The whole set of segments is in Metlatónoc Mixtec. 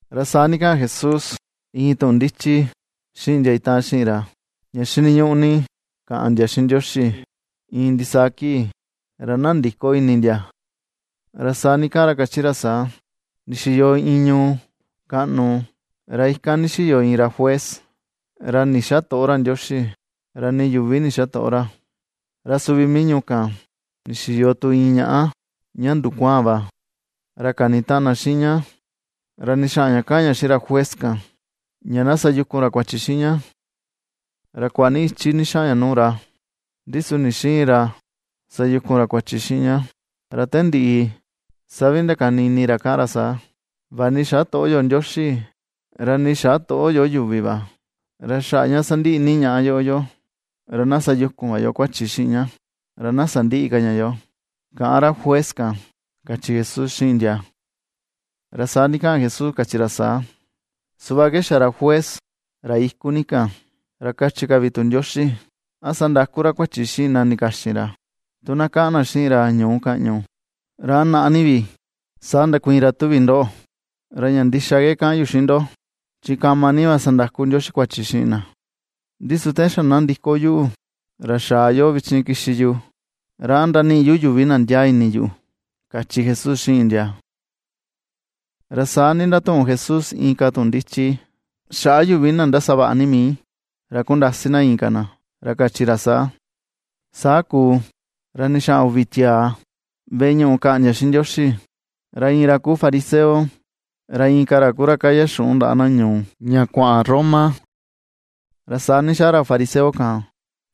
Ra saa ndikaꞌan Jesús iin tuꞌun ndichi xiꞌin ndia itaꞌan xiꞌin ra, ña xiniñuꞌu ni kaꞌan ndia xiꞌin Ndioxi iin ndisaa kii, ra na ndïko ini ndia. Ra saa ndikaꞌan ra kachi ra saa: ―Ndixiyo iin ñuu kaꞌnu ra ikan ndixiyo iin ra juez ra ndixätoꞌo ra Ndioxi, ra nii yuvi ndixätoꞌo ra. Ra suvi mii ñuu kan ndixiyo tu iin ñaꞌa ña ndukuaan va, ra kanitaꞌan na xiꞌin ña, ra ndixaꞌan ña kaꞌan ña xiꞌin ra juez kan ña na sayukun ra kuachi xiꞌin ña. Ra kuaꞌa ni ichi ndixaꞌan ña nuu ra, ndi su ndixïin ra sayukun ra kuachi xiꞌin ña. Ra te ndiꞌi saa vi ndakani ini ra kaꞌan ra saa: “Vaꞌa ni xätoꞌo yo Ndioxi, ra nii xätoꞌo yo yuvi va, ra xaꞌa ña sandiꞌi ni ñaꞌa yoꞌo yoo, ra na sayukun va yo kuachi xiꞌin ña ra na sandïꞌi ka ña yoo”, kaꞌan ra juez kan ―kachi Jesús xiꞌin ndia. Ra saa ndikaꞌan Jesús kachi ra saa: ―Suꞌva ke xa ra juez ra iku ni kan. Ra kachi ka vi tu Ndioxi, ¿a sandäku ra kuachi xiꞌin na ndikaxin ra tu na kaꞌan na xiꞌin ra ñuu kaꞌñu? ¿Ra a naꞌa ni vi sa ndakuiin ra tuvi ndo? Ra ña ndixa ke kaꞌan yu xiꞌin ndo, chi kama ni va sandaku Ndioxi kuachi xiꞌin na. Ndi su te xa na ndiko yuꞌu ra xaa yoꞌo vichin kixi yu, ¿ra a ndaniꞌi yu yuvi na ndiaa ini yuꞌu? ―kachi Jesús xiꞌin ndia. Ra saa ndatuꞌun Jesús inka tuꞌun ndichi xaꞌa yuvi na ndasavaꞌa ni mii, ra kundasi na inka na, ra kachi ra saa: ―Saa kuu ra ndixaꞌan uvi tiaa veꞌe ñuꞌu kaꞌan ndia xiꞌin Ndioxi. Ra iin ra kuu fariseo, ra inka ra ku ra kaya xuꞌun ndaꞌa na ñuu, ña kuaꞌan Roma. Ra saa ndixaa ra fariseo kan,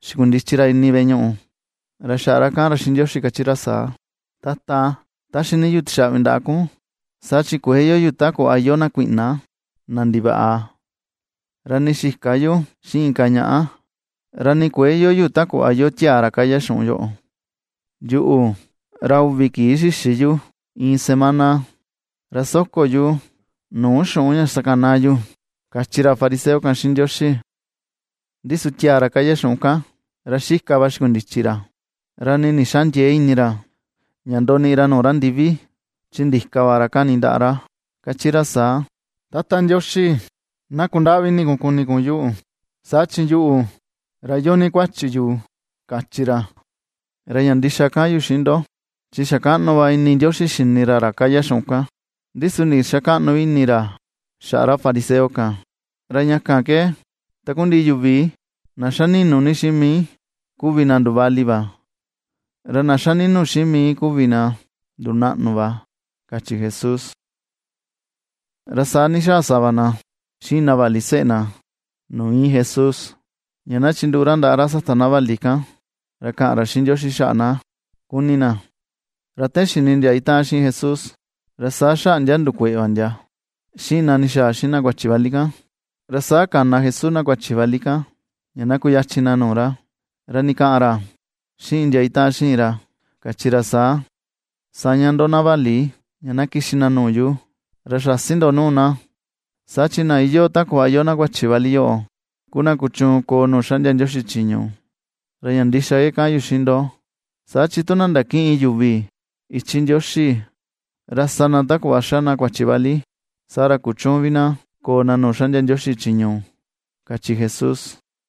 xikundichi ra ini veꞌe ñuꞌu, ra xaꞌa kaꞌan ra xiꞌin Ndioxi kachi ra saa: “Tata, taxi ni yu tixaꞌvi ndaꞌa kun, saa chi kuëe iyoo yu ta kuꞌva iyoo na kuiꞌna, na ndivaꞌa, ra nii xïka yu xiꞌin inka ñaꞌa; ra ni kuëe iyoo yu ta kuꞌva iyoo tiaa ra kaya xuꞌun yoꞌo. Yuꞌu, ra uvi kii xïxi yu iin semana; ra soko yu nuu xuꞌun ña xakanaa yu”, kachi ra fariseo kan xiꞌin Ndioxi. Ndi su tiaa ra kaya xuꞌun kan, ra xika va xikundichi ra. Ra nii ndixäa ndiee ini ra ña ndoniꞌi ra nuu ra ndivi, chi ndika va ra kani ndaꞌa ra kachi ra saa: “¡Tata Ndioxi, na kundaꞌvi ini kun kuni kun yuꞌu. Saa chi yuꞌu, ra iyoo ni kuachi yu!”, kachi ra. Ra ña ndixa kaꞌan yu xiꞌin ndo, chi xa kaꞌnu va ini Ndioxi xini ra ra kaya xuꞌun kan. Ndi su ndixakäꞌnu vi ini ra xaꞌa ra fariseo kan. Ra ña kan ke takundiꞌi yuvi na xa ni̱nù ni xiꞌin mii kuvi na nduvali va, ra na xa ni̱nu̱ xiꞌin mii kuvi na ndunaꞌnu va ―kachi Jesús. Ra saa ndixaa sava na xiꞌin na vali seꞌe na nuu iin Jesús, ña na chinduꞌu ra ndaꞌa ra sata na vali kan, ra kaꞌan ra xiꞌin Ndioxi xaꞌa na kuni na. Ra te xini ndia itaꞌan xiꞌin Jesús ra saa xaꞌa ndia ndukueꞌe va ndia xiꞌin na ndixaa xiꞌin na kuachi vali kan. Ra saa kana Jesús na kuachi vali kan ña na kuyachin na nuu ra, ra ndikaꞌan ra xiꞌin ndia itaꞌan xiꞌin ra kachi ra saa: ―Saña ndo na vali ña na kixi na nuu yu, ra säsi ndo nuu na. Saa chi na iyoo ta kuꞌva iyoo na kuachi vali yoꞌo ku na kuchuun koo nuu xaꞌndia Ndioxi chiñu. Ra ña ndixa ke kaꞌan yu xiꞌin ndo, saa chi tu na ndakïꞌin yuvi ichi Ndioxi ra sa na ta kuꞌva xa na kuachi vali, saa ra kuchüun vi na koo na nuu xaꞌndia Ndioxi chiñu ―kachi Jesús.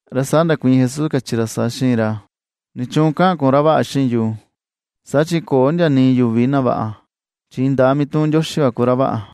Ra saa ndakuiin Jesús kachi ra saa xiꞌin ra: ―¿Nichuun kaꞌan kun “ra vaꞌa” xiꞌin yu?, saa chi köo ndia nii yuvi na vaꞌa, chi indaa mituꞌun Ndioxi va ku ra vaꞌa.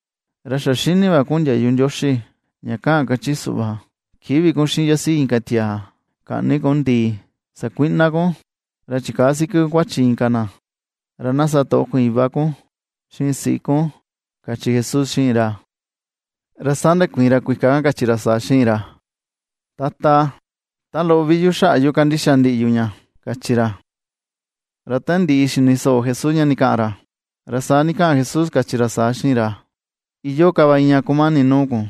Ra xa xini va kun ndiayu Ndioxi ña kaꞌan kachi suꞌva: “Kïꞌvi kun xiꞌin yasiꞌi inka tiaa, käꞌni kun ndii, xakuïꞌna kun, ra chikäa siki kun kuachi inka na; ra na satoꞌo kun iva kun xiꞌin siꞌi kun” ―kachi Jesús xiꞌin ra. Ra saa ndakuiin ra kuika kan kachi ra saa xiꞌin ra: ―Tata, ta loꞌo vi yu xaꞌa yu kandixa ndiꞌi yu ña ―kachi ra. Ra te ndiꞌi xini soꞌo Jesús ña ndikaꞌan ra, ra saa ndikaꞌan Jesús kachi ra saa xiꞌin ra: ―Iyoo ka va iin ña kumani nuu kun: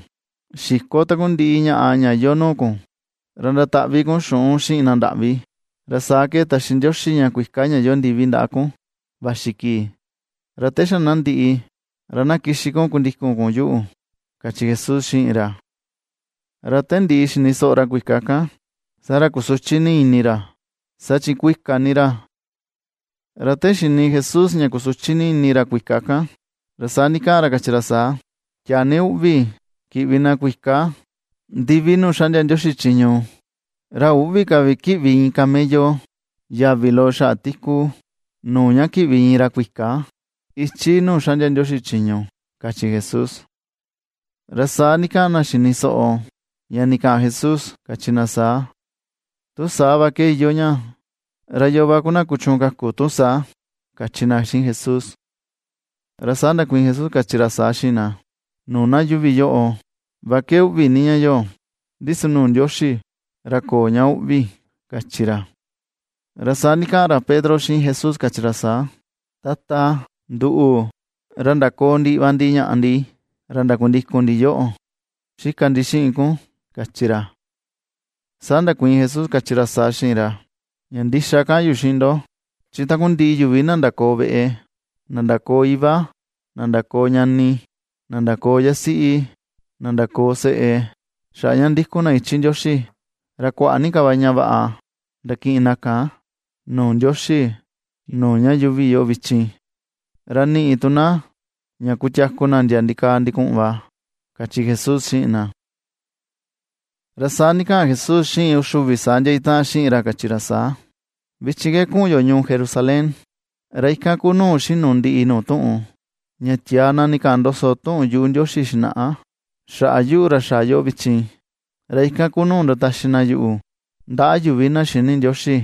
Xiko takundiꞌi ñaꞌa ña iyoo nuu kun, ra ndataꞌvi kun xuꞌun xiꞌin na ndaꞌvi, ra saa ke taxi Ndioxi ña kuika ña iyoo ndivi ndaꞌa kun vaxi kii. Ra te xa na ndiꞌi, ra na kixi kun kundikun kun yuꞌu ―kachi Jesús xiꞌin ra. Ra te ndiꞌi xini soꞌo ra kuika kan, saa ra kusuchi ni ini ra saa chi kuika ni ra. Ra te xini Jesús ña kusuchi ni ini ra kuika kan, ra saa ndikaꞌan ra kachi ra saa: ―¡Tiaa ni uꞌvi kiꞌvi na kuika ndivi nuu xaꞌndia Ndioxi chiñu! Ra üꞌvi ka vi kiꞌvi iin camello yavi loꞌo xaꞌa tiku, nuu ña kiꞌvi iin ra kuika ichi nuu xaꞌndia Ndioxi chiñu ―kachi Jesús. Ra saa ndikaꞌan na xini soꞌo, ña ndikaꞌan Jesús kachi na saa: ―Tu saa va ke iyoo ña, ¿ra yoo va ku na kuchuun kaku tu saa? ―kachi na xiꞌin Jesús. Ra saa ndakuiin Jesús kachi ra saa xiꞌin na: ―Nuu na yuuvi yoꞌo va ke uꞌvi ni ña yoꞌo, ndi su nuu Ndioxi ra köo ña uꞌvi ―kachi ra. Ra saa ndikaꞌan ra Pedro xiꞌin Jesús kachi ra saa: ―Tata, nduꞌu, ra ndakoo ndiꞌi va ndi ñaꞌa ndi, ra ndakundikun ndi yoꞌo, xika ndi xiꞌin kun ―kachi ra. Saa ndakuiin Jesús kachi ra saa xiꞌin ra: ―Ña ndixa kaꞌan yu xiꞌin ndo: chi takundiꞌi yuvi na ndakoo veꞌe, na ndakoo iva, na ndakoo ñani, na ndakoo yasiꞌi, na ndakoo seꞌe xaꞌa ña ndikun na ichi Ndioxi, Ra kuaꞌa ni ka va ña vaꞌa ndakiꞌin na kan nuu Ndioxi nuu ña yuuvi yoꞌo vichin, ra niꞌi tu na ña kutiaku na ndia ndikaa ndikuꞌun va ―kachi Jesús xiꞌin na. Ra saa ndikaꞌan Jesús xiꞌin uxi uvi saa ndia itaꞌan xiꞌin ra kachi ra saa: ―Vichin ke kuꞌun yo ñuu Jerusalén, ra ikan ku nuu xinu ndiꞌi nuu tuꞌun ña tiaa na ndikaꞌan ndoso tuꞌun yuꞌu Ndioxi xinaꞌa xaꞌa yuꞌu ra xaa yoꞌo vichin. Ra ikan ku nuu ndataxi na yuꞌu ndaꞌa yuvi na xïni Ndioxi,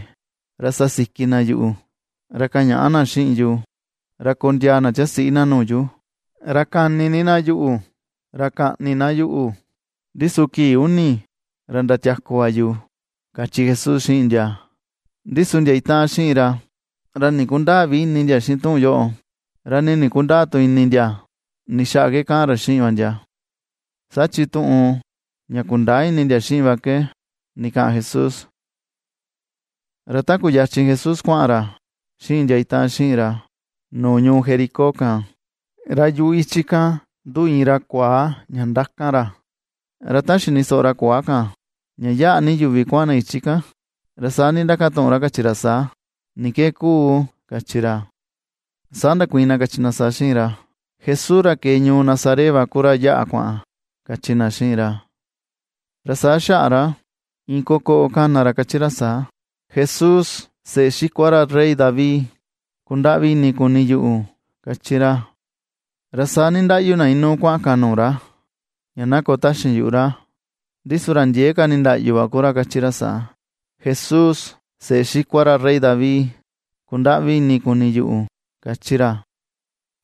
ra sasiki na yuꞌu, ra kaꞌan ñaa na xiꞌin yu, ra kondiaa na tiasiꞌi na nuu yu. Ra kani ni na yuꞌu, ra kaꞌni na yuꞌu, ndi su kii uni ra ndatiaku va yu ―kachi Jesús xiꞌin ndia. Ndi su ndia itaꞌan xiꞌin ra ra ndikundäa vi ini ndia xiꞌin tuꞌun yoꞌo, ra nii ndikundäa tu ini ndia ni xaꞌa ke kaꞌan ra xiꞌin va ndia, saa chi tuꞌun ña kundäa ini ndia xiꞌin va ke ndikaꞌan Jesús. Ra ta kuyachin Jesús kuaꞌan ra xiꞌin ndia itaꞌan xiꞌin ra nuu ñuu Jericó kan, ra yuꞌu ichi kan nduꞌu iin ra kuaa ña ndakan ra. Ra ta xini soꞌo ra kuaa kan ña yaꞌa ni yuvi kuaꞌan na ichi kan. Ra saa ndindakatuꞌun ra kachi ra saa: ―¿Ni ke kuu? ―kachi ra. Saa ndakuiin na kachi na saa xiꞌin ra: ―Jesús, ra ke̱e ñuu Nazaret va ku ra yaꞌa kuaꞌan ―kachi na xiꞌin ra. Ra saa xaꞌa ra iin kokoꞌo kana ra kachi ra saa: ―¡Jesús, seꞌe xikua ra rey David, kundaꞌvi ini kuni yuꞌu! ―^kachi ra. Ra saa nindaꞌyu na inuu kuaꞌan kan nuu ra, ña na koo taxin yuꞌu ra, ndi su ra ndiee ka nindaꞌyu va kuvi ra kachi ra saa: ―¡Jesús seꞌe xikua ra rey David, kundaꞌvi ini kuni yuꞌu! ―kachi ra.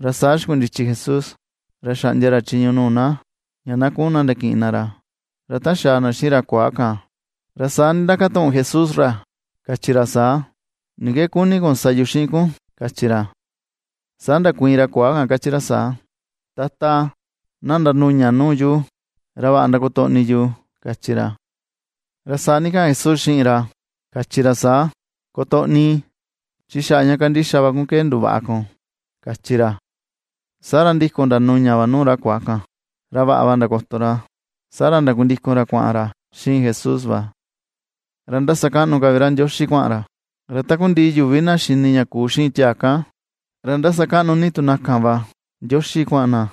Ra saa xikundichi Jesús, ra xaꞌndia ra chiñu nuu na ña na kuꞌun na ndakiꞌin na ra. Ra ta xaa na xiꞌin ra kuaa kan, ra saa ndindakatuꞌun Jesús ra kachi ra saa: ―¿Ni ke kuni kun sa yu xiꞌin kun? ―kachi ra. Saa ndakuiin ra kuaa kan kachi ra saa: ―Tata, na ndanuña nuu yu ra vaꞌa kotoꞌni yu ―kachi ra. Ra saa ndikaꞌan Jesús xiꞌin ra kachi ra saa: ―¡Kotoꞌni! Chi xaꞌa ña kandixa va kun ke nduvaꞌa kun ―kachi ra. Saa ra ndikun ndanuña va nuu ra kuaa kan ra vaꞌa va ndakoto ra. Saa ra ndakundikun ra kuaꞌan ra xiꞌin Jesús va, ra ndasakaꞌnu ka vi ra Ndioxi kuaꞌan ra. Ra takundiꞌi yuvi na xini ña kuu xiꞌin tiaa kan, ra ^ndasakaꞌnu ni tu na kan va Ndioxi kuaꞌan na.